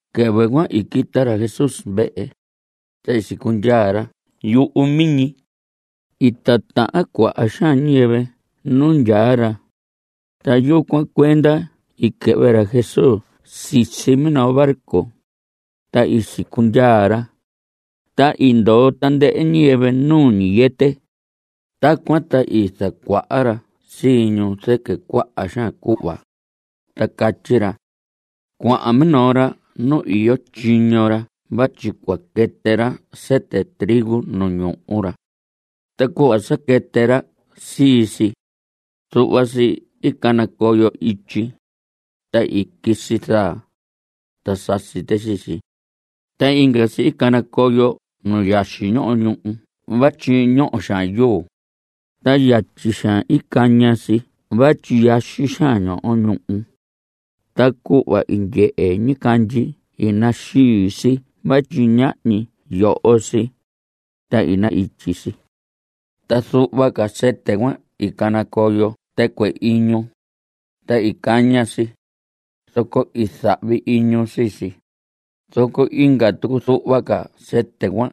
Quɨvɨ cuan i quita ra Jesús vehe, ta i sicundyaa ra yuhu miñi. I titahan cuaha xaan ñiyɨvɨ nu ndyaa ra, ta yucuan cuenda i quɨhvɨ ra Jesús sisi minoo barco, ta i sicundyaa ra. Ta i ndoo tandɨhɨ ñiyɨvɨ nu ñiyɨtɨ. Tacuan ta i zacuaha ra sii ñu zɨquɨ cuaha xaan cuhva, ta catyi ra: Cuahan minoo ra nu iyo tyiño ra vatyi cua quɨtɨ ra sɨtɨ trigo nu ñuhu ra. Ta cuhva sa quɨtɨ ra sii si, zuhva si i canacoyo ityi. Ta i quisi zaa, ta sasi tɨ sii si. Ta inga si i canacoyo nu yaxi ñoho ñuhu vatyi ñoho xaan yuu. Ta yatyi xaan i caña si vatyi yaxi xaan ñoho ñuhu. Ta cuhva i ndyehe ñicandyi i naxii si vatyi ñahñi yoho si, ta i na‑ityi si. Ta zuhva ca sɨtɨ cuan i canacoyo tɨcuɨ iñu. Ta i caña si, zoco i zahvi iñu sii si. Zoco inga tucu zuhva ca sɨtɨ cuan,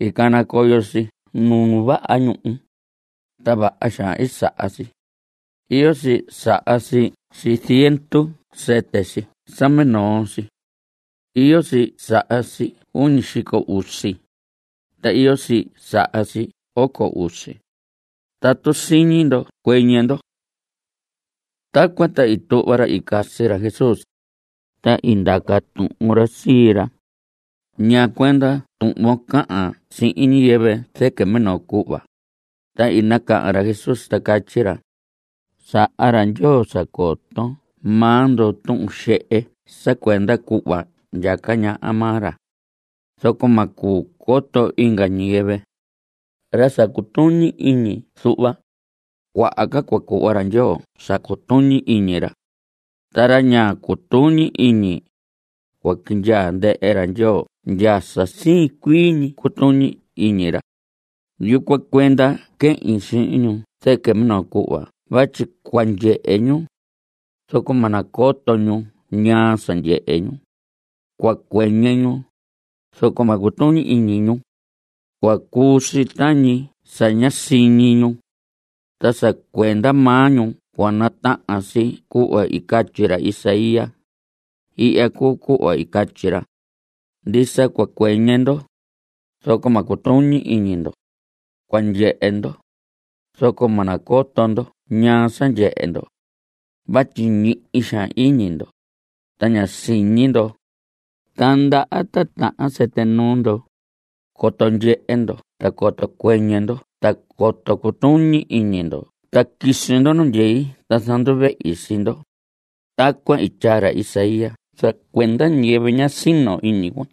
i canacoyo si nu vaha ñuhu, ta vaha xaan i saha si. Iyo si saha si ziendu sɨtɨ si sa minoo ñi si. Iyo si saha si uñi xico usi. Ta iyo si saha si oco usi. Tatu siñi ndo, ¡cuɨñɨ ndo! Tacuan ta i tuhva ra i casi ra Jesús, ta i ndaca tuhun ra sii ra: ¿Ñaa cuenda tuhvon cahan sihin ñiyɨvɨ zɨquɨ minoo cuhva? Ta i nacahan ra Jesús, ta catyi ra: Saha ra Ndyoo sa coto maa ndo tuhun xehe sa cuenda cuhva ndyaca ñaha maa ra. Zoco ma cuu coto inga ñiyɨvɨ. Ra sa cutuñi iñi zuhva, cuaha ca cua cuhva ra Ndyoo sa cutuñi iñi ra. Ta ra ña cutuñi iñi, cua quindyaa ndɨhɨ ra Ndyoo ndya sa siin cuii ñi cutuñi iñi ra. Yucuan cuenda quehin sihin ñu zɨquɨ minoo cuhva vatyi cua ndyehe ñu, zoco ma coto ñu ñaa sa ndyehe ñu. Cua cuɨñɨ ñu, zoco ma cutuñi iñi ñu. Cua cuu si tañi sa ñá siñi ñu. Ta sa cuenda maa ñu cua natahan si cuhva i catyi ra Isaías. Ihya cuu cuhva i catyi ra: Ndisa cua cuɨñɨ ndo, zoco ma cutuñi iñi ndo; Cua ndyehe ndo, zoco ma nacoto ndo ñaa sa ndyehe ndo. Vatyi ñihi xaan iñi ndo, ta ña siñi ndo, ta ndaha titahan sɨtɨ nuu ndo; coto ndyehe ndo ta coto cuɨñɨ ndo ta coto cutuñi iñi ndo ta quisi ndo nu ndyei ta zanduvehi sii ndo. Tacuan i tyaa ra Isaías sa cuenda ñiyɨvɨ ña sino iñi cuan.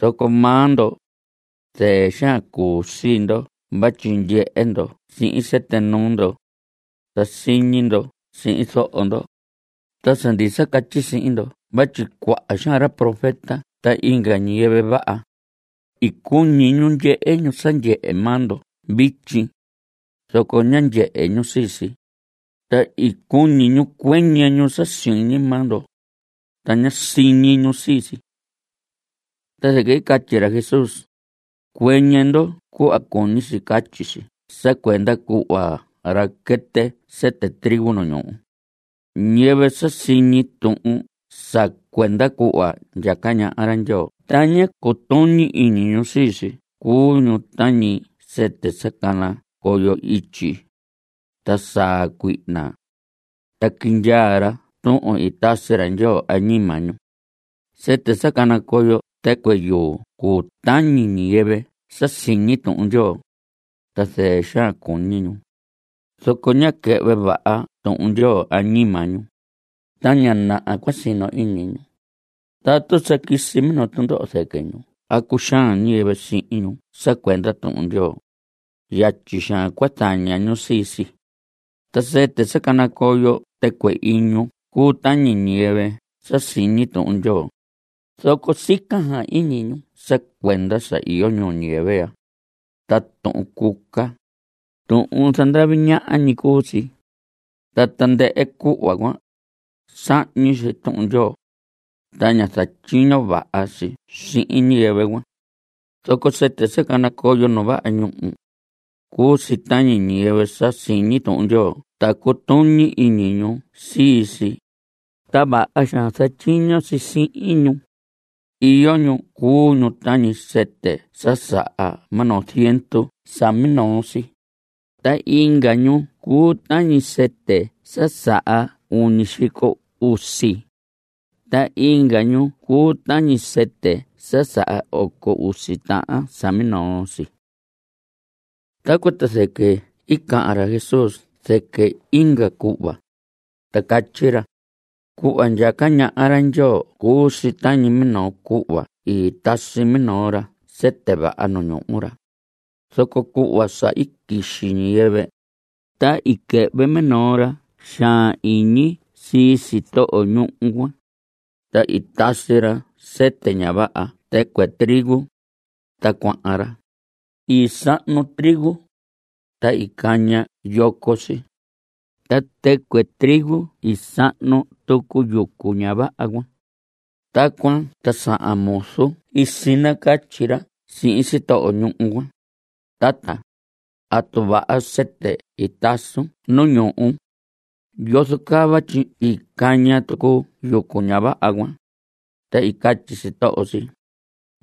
Zoco maa ndo, zɨɨ xaan cuu sii ndo vatyi ndyehe ndo sihin sɨtɨ nuu ndo, ta siñi ndo sihin zoho ndo. Ta sa ndisa catyi sihin ndo vatyi cuaha xaan ra profeta ta inga ñiyɨvɨ vaha, i cuñi ñu ndyehe ñu sa ndyehe maa ndo vityi, zoco ñá ndyehe ñu sii si. Ta i cuñi ñu cuɨñɨ ñu sa siñi maa ndo, ta ñá siñi ñu sii si. Ta zɨquɨ i catyi ra Jesús: Cuɨñɨ ndo cuhva cuñi si catyi si sa cuenda cuhva ra quɨtɨ sɨtɨ trigo nu ñuhu. Ñiyɨvɨ sa siñi tuhun sa cuenda cuhva ndyaca ñaha ra Ndyoo ta ña cutuñi iñi ñu sii si cuu ñu tañi sɨtɨ sa canacoyo ityi. Ta saa cuihna, ta quindyaa ra tuhun i tasi ra Ndyoo añima ñu. Sɨtɨ sa canacoyo tɨcuɨ yuu cuu tañi ñiyɨvɨ sa siñi Tuhun Ndyoo, ta zɨɨ xaan i cuñi ñu. Zoco ñá quɨhvɨ vaha Tuhun Ndyoo añima ñu. Ta ña naha cua sino iñi ñu. Tatu sa quisi minoo tundoho zɨquɨ ñu a cuxaan ñiyɨvɨ sihin ñu sa cuenda Tuhun Ndyoo, yatyi xaan cua zaña ñu sii si. Ta sɨtɨ sa canacoyo tɨcuɨ iñu cuu tañi ñiyɨvɨ sa siñi Tuhun Ndyoo, zoco sica xaan iñi ñu sa cuenda sa iyo ñuu ñiyɨvɨ ya. Ta tuhun cuca, tuhun zandavi ñaha ñi cuu si. Ta tandɨhɨ cuhva cuan, sahñi si Tuhun Ndyoo, ta ña zatyiño vaha si sihin ñiyɨvɨ cuan. Zoco sɨtɨ sa canacoyo nu vaha ñuhu, cuu si tañi ñiyɨvɨ sa siñi Tuhun Ndyoo ta cutuñi iñi ñu sii si, ta vaha xaan zatyiño si sihin ñu. Iyo ñu cuu ñu tañi sɨtɨ sa saha minoo ziendu sa minoo si. Ta inga ñu cuu tañi sɨtɨ sa saha uñi xico usi. Ta inga ñu cuu tañi sɨtɨ sa saha oco usi tahan sa minoo si. Tacuan ta zɨquɨ i cahan ra Jesús zɨquɨ inga cuhva, ta catyi ra: Cuhva ndyaca ñaha ra Ndyoo cuu si tañi minoo cuhva i tasi minoo ra sɨtɨ vaha nu ñuhu ra. Zoco cuhva sa i quixi ñiyɨvɨ, ta i quɨhvɨ minoo ra xaan iñi sii sitoho ñuhu cuan, ta i tasi ra sɨtɨ ña vaha tɨcuɨ trigo, ta cuahan ra. I sahnu trigo, ta i caña yoco si. Ta tɨcuɨ trigo i sahnu tucu yucu ña vaha cuan. Tacuan ta sahan muzu i sinacatyi ra sihin sitoho ñuhu cuan: “Tata, tatu vaha sɨtɨ i tasun nu ñuhun, ¿yozo caa vatyi i caña tucu yucu ña vaha cuan?” Ta i catyi sitoho si: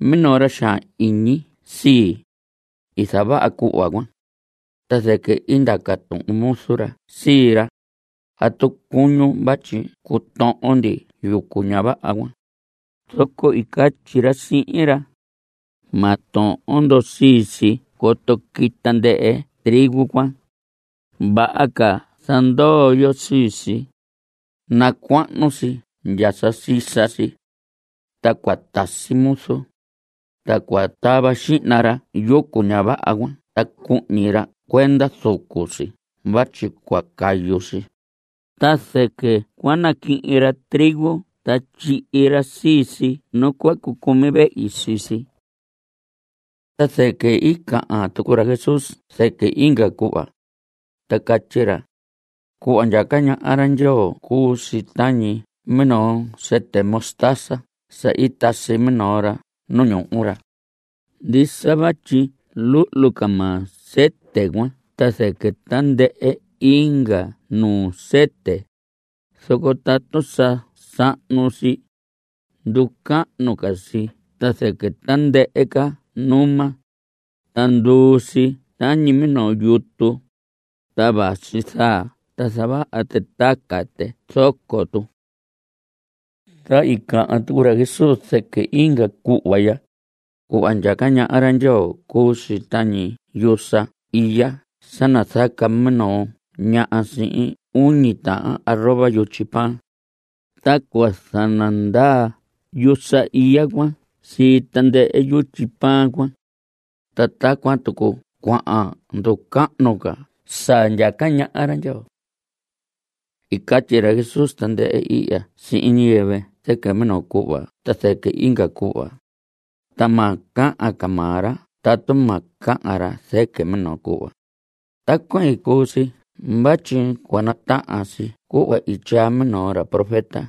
“Minoo ra xaan iñi sii, i zavaha cuhva cuan.” Ta zɨquɨ i ndaca tuhun muzu ra sii ra: “¿Atu cuñun vatyi cutohon ndi yucu ña vaha cuan?” Zoco i catyi ra sihin ra: “Ma tohon ndo sii si coto quita ndɨhɨ trigo cuan. Vaha ca zandoo yo sii si, nacuahnu si ndya sa sisa si. Ta cua tasi muzu, ta cua tava xihna ra yucu ña vaha cuan ta cuhñi ra cuenda zucu si vatyi cua cayu si. Ta zɨquɨ cua naquihin ra trigo ta tyihi ra sii si nu cua cucumi vehi sii si.” Ta zɨquɨ i cahan tucu ra Jesús zɨquɨ inga cuhva, ta catyi ra: Cuhva ndyaca ñaha ra Ndyoo cuu si tañi minoo sɨtɨ mostaza sa i tasi minoo ra nu ñuhu ra. Ndisa vatyi luhlu ca maa sɨtɨ cuan ta zɨquɨ tandɨhɨ inga nuu sɨtɨ, zoco tatu sa sahnu si, nducahnu ca si ta zɨquɨ tandɨhɨ ca numa, ta nduu si tañi minoo yutu. Ta vasi zaa ta zavaha tɨ taca tɨ zoco tu. Ta i cahan tucu ra Jesús zɨquɨ inga cuhva ya: Cuhva ndyaca ñaha ra Ndyoo cuu si tañi yusa iya sa nazaca minoo ñaha sihin uñi taha arroba yutyi pan, ta cua zanandaa yusa iya cuan sii tandɨhɨ yutyi pan cuan. (Ta tacuan tucu cuahan nducahnu ca sa ndyaca ñaha ra Ndyoo.) I catyi ra Jesús tandɨhɨ ihya sihin ñiyɨvɨ zɨquɨ minoo cuhva ta zɨquɨ inga cuhva, ta ma cahan maa ra tatu ma cahan ra zɨquɨ minoo cuhva. Tacuan i cuu si vatyi cua natahan si cuhva i tyaa minoo ra profeta.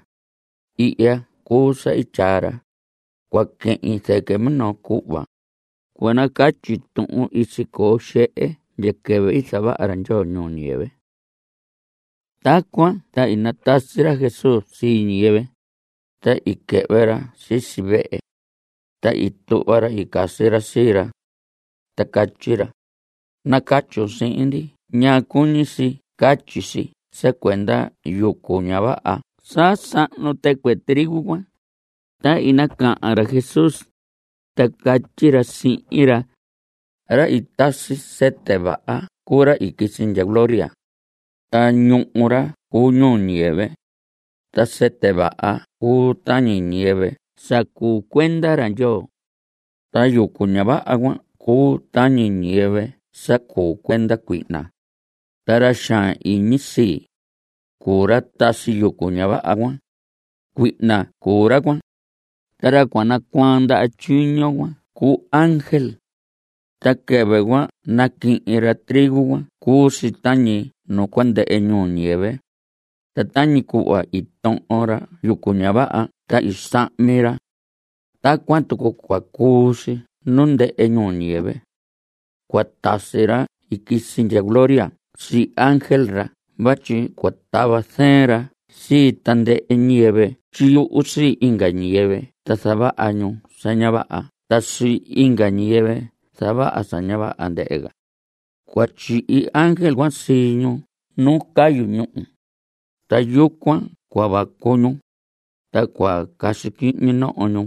Ihya cuu sa i tyaa ra: Cua quehin zɨquɨ minoo cuhva; cua nacatyi tuhun i sicoo xehe ndya quɨvɨ i zavaha ra Ndyoo ñuu ñiyɨvɨ. Tacuan ta i natasi ra Jesús sii ñiyɨvɨ, ta i quɨhvɨ ra sisi vehe, ta i tuhva ra i casi ra sii ra, ta catyi ra: Nacatyun sihin ndi ñaa cuñi si catyi si sa cuenda yucu ña vaha sa sahnu tɨcuɨ trigo cuan. Ta i nacahan ra Jesús, ta catyi ra sihin ra: Ra i tasi sɨtɨ vaha cuu ra i quisi ndya gloria. Ta ñuhu ra cuu ñuu ñiyɨvɨ. Ta sɨtɨ vaha cuu tañi ñiyɨvɨ sa cuu cuenda ra Ndyoo. Ta yucu ña vaha cuan cuu tañi ñiyɨvɨ sa cuu cuenda cuihna. Ta ra xaan iñi sii, cuu ra tasi yucu ña vaha cuan. Cuihna cuu ra cuan. Ta ra cua nacuaan ndaha tyiño cuan cuu ángel. Ta quɨvɨ cua naquihin ra trigo cuan cuu si tañi nu cua ndɨhɨ ñuu ñiyɨvɨ. Ta tañi cuhva i tohon ra yucu ña vaha ta i sahmi ra, tacuan tucu cua cuu si nu ndɨhɨ ñuu ñiyɨvɨ. Cua tasi ra i quisi ndya gloria sii ángel ra vatyi cua tava zɨɨn ra sii tandɨhɨ ñiyɨvɨ tyiyuhu sii inga ñiyɨvɨ ta zavaha ñu sa ña vaha ta sii inga ñiyɨvɨ zavaha sa ña vaha, ndɨhɨ ca. Cua tyihi ángel sii ñu nu cayu ñúhu. Ta yucuan cua vacu ñu, ta cua casi quihñi noho ñu.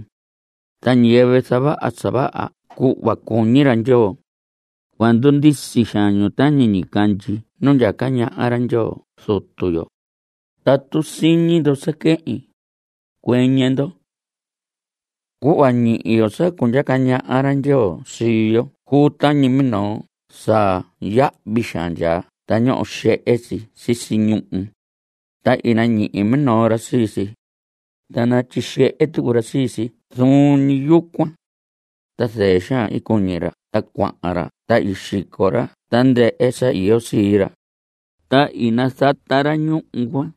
Ta ñiyɨvɨ zavaha sa vaha cuhva cuñi ra Ndyoo, cua ndundisi xaan ñu tañi ñicandyi nu ndyaca ñaha ra Ndyoo Zutu yo. Tatu siñi ndo sa quehin, cuɨñɨ ndo. Cuhva ñihi yo sa cundyaca ñaha ra Ndyoo sii yo cuu tañi minoo sa yahvi xaan ndyaa ta ñoho xehe si sisi ñuhu. Ta i nañihi minoo ra sii si, ta natyixehe tucu ra sii si zuun ñi yucuan. Ta zɨɨ xaan i cuñi ra ta cuahan ra ta i xico ra tandɨhɨ sa iyo sii ra, ta i nazata ra ñuhu cuan.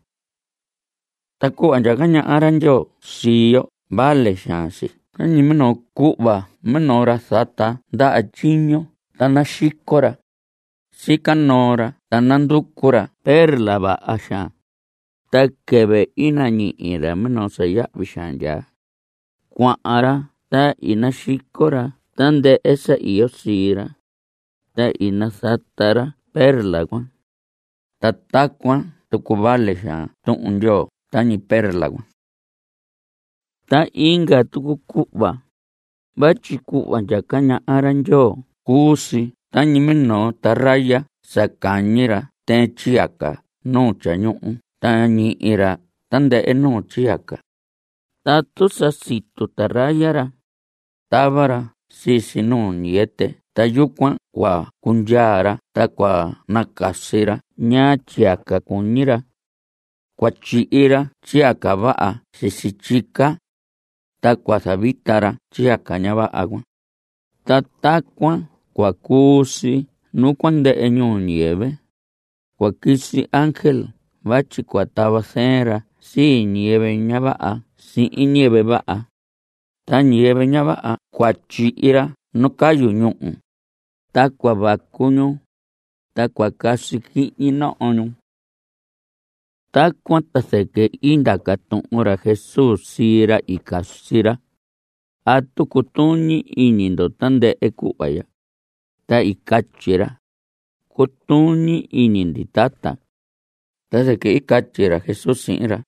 Ta cuhva ndyaca ñaha ra Ndyoo sii yo vale xaan si tañi minoo cuhva minoo ra zata ndaha tyiño ta naxico ra. Sica noo ra ta nanducu ra perla vaha xaan. Ta quɨvɨ i nañihi ra minoo sa yahvi xaan ndyaa, cuahan ra ta i naxico ra tandɨhɨ sa iyo sii ra, ta i nazata ra perla cuan. (Ta tacuan tucu vale xaan Tuhun Ndyoo tañi perla cuan.) Ta inga tucu cuhva, vatyi cuhva ndyaca ñaha ra Ndyoo cuu si tañi minoo taraya sa cañi ra tɨɨn tyiyaca nu tyañuhu ta ñihi ra tandɨhɨ nuu tyiyaca. Tatu sa situ taraya ra, tava ra sii si nu ñiyɨtɨ ta yucuan cua cundyaa ra ta cua nacasi ra ñaa tyiyaca cuñi ra. Cua tyihi ra tyiyaca vaha sisi tyica, ta cua zavita ra tyiyaca ña vaha cuan. Ta tacuan cua cuu si nu cua ndɨhɨ ñuu ñiyɨvɨ. Cua quisi ángel vatyi cua tava zɨɨn ra sii ñiyɨvɨ ña vaha sihin ñiyɨvɨ vaha. Ta ñiyɨvɨ ña vaha cuan cua tyihi ra nu cayu ñúhu, ta cua vacu ñu, ta cua casi quihñi noho ñu. Tacuan ta zɨquɨ i ndaca tuhun ra Jesús sii ra i casi ra: ¿Atu cutuñi iñi ndo tandɨhɨ cuhva ya? Ta i catyi ra: Cutuñi iñi ndi, tata. Ta zɨquɨ i catyi ra Jesús sihin ra: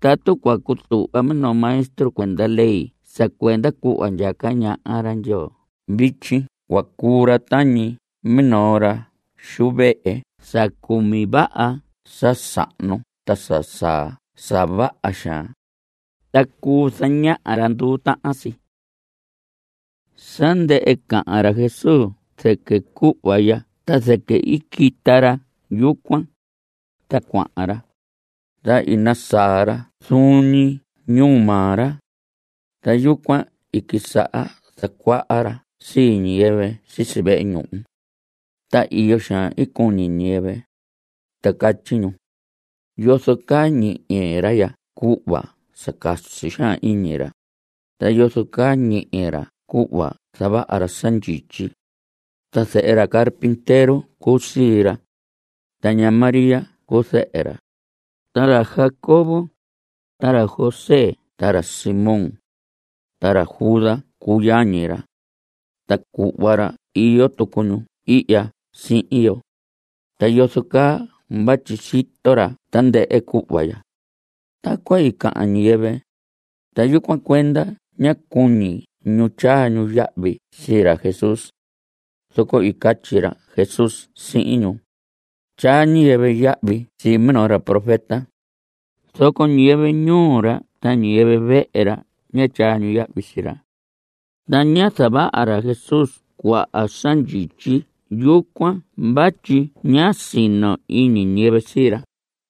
Tatu cua cutuhva minoo maestro cuenda ley sa cuenda cuhva ndyaca ñaha ra Ndyoo vityi cua cuu ra tañi minoo ra xu vehe sa cumi vaha sa sahnu ta sa saa sa vaha xaan, ta cuu zañaha ra nduu tahan si. Sa ndɨhɨ cahan ra Jesús zɨquɨ cuhva ya ta zɨquɨ i quita ra yucuan, ta cuahan ra. Ta i nasaa ra zuun ñi ñuu maa ra. Ta yucuan i quisaha zacuaha ra sii ñiyɨvɨ sisi vehe ñuhu. Ta iyo xaan i cuñi ñiyɨvɨ, ta catyi ñu: ¿Yozo caa ñihi ra ya cuhva sa casi xaan iñi ra? ¿Ta yozo caa ñihi ra cuhva zavaha ra sa ndyityi? Ta zehe ra carpintero cuu sii ra. Ta ña María cuu zɨhɨ ra. Ta ra Jacobo, ta ra José, ta ra Simón, ta ra Judas cuu yañi ra. Ta cuhva ra iyo tucu ñu ihya sihin yo. ¿Ta yozo caa vatyi sito ra tandɨhɨ cuhva ya? Tacuan i cahan ñiyɨvɨ, ta yucuan cuenda ñá cuñi ñu tyaa ñu yahvi sii ra Jesús. Zoco i catyi ra Jesús sihin ñu: Tyaa ñiyɨvɨ yahvi sii minoo ra profeta, zoco ñiyɨvɨ ñuu ra ta ñiyɨvɨ vehe ra ña tyaa ñu yahvi sii ra. Ta ñá zavaha ra Jesús cuaha sa ndyityi yucuan vatyi ñá sino iñi ñiyɨvɨ sii ra.